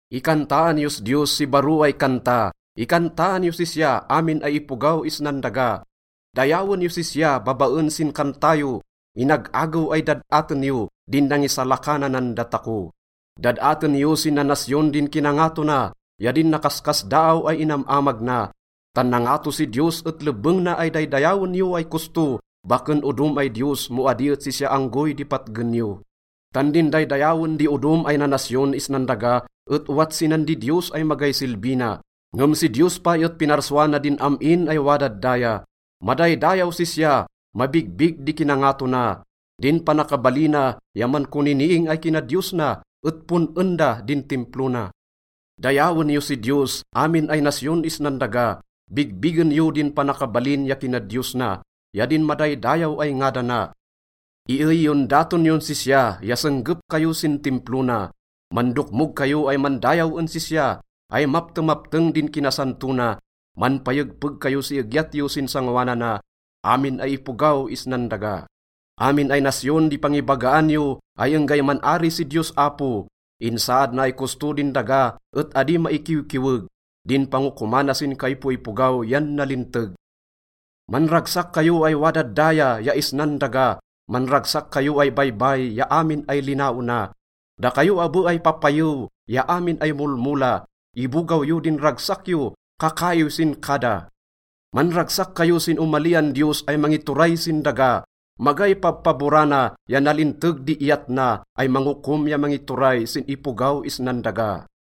Ikantaan yos Diyos si baro ay kanta, ikantaan yos sisya, amin ay ipogaw isnan daga. Dayawen yos sisya babaen sin kanta yo. Inag-agew ay dad-aten yo din nangisalakananan datako. Dad-aten yo sin nanasyon din kinangato na ya din nakaskasdaaw ay inam-amag na. Tan nangato si Diyos et lebbeng na ay daydayawen yo ay kosto, baken odom ay diyos mo adi et sisya anggoy di patgen yo. Tan din daydayawen di odom ay nanasyon isnan daga et owat sinan didiyos ay magay silbi na, ngem si Diyos pay et pinarsua na din am-in ay wadad daya. Madaydayaw sisya, mabigbig di kinangato na. Din panakabalina ya mankoniniing ay kinadiyos na et pon-en da din Timplo na. Dayawen yo si Diyos, amin ay nasyon isnan daga, bigbigen yo din panakabalin ya kinadiyos na ya din madaydayaw ay ngadana. Iey yon daton yon sisya ya senggep kayo sin Timplo na. Mandokmog kayo ay mandayaw en sisya ay maptemapteng din kinasanto na. Manpayegpeg kayo si egyat yo sin sangoanana, amin ay ipogaw isnan daga. Amin ay nasyon di pangibagaan yo ay enggay man-ari si Diyos Apo. Insaad na ay kosto din daga et adi maikiwkiweg. Din pangokomana sin kaipoipogaw yan nalinteg. Manragsak kayo ay wadad daya ya isnan daga, manragsak kayo ay baybay ya amin ay linaona, dakayo abe ay papayew ya amin ay molmola, ibogaw yo din ragsak yo, kakaiw sin kada. Manragsak kayo sin omalian Diyos ay mangituray sin daga. Magay pabpaborana ya nalinteg di iyat na ay mangokom ya mangituray sin ipogaw isnan daga.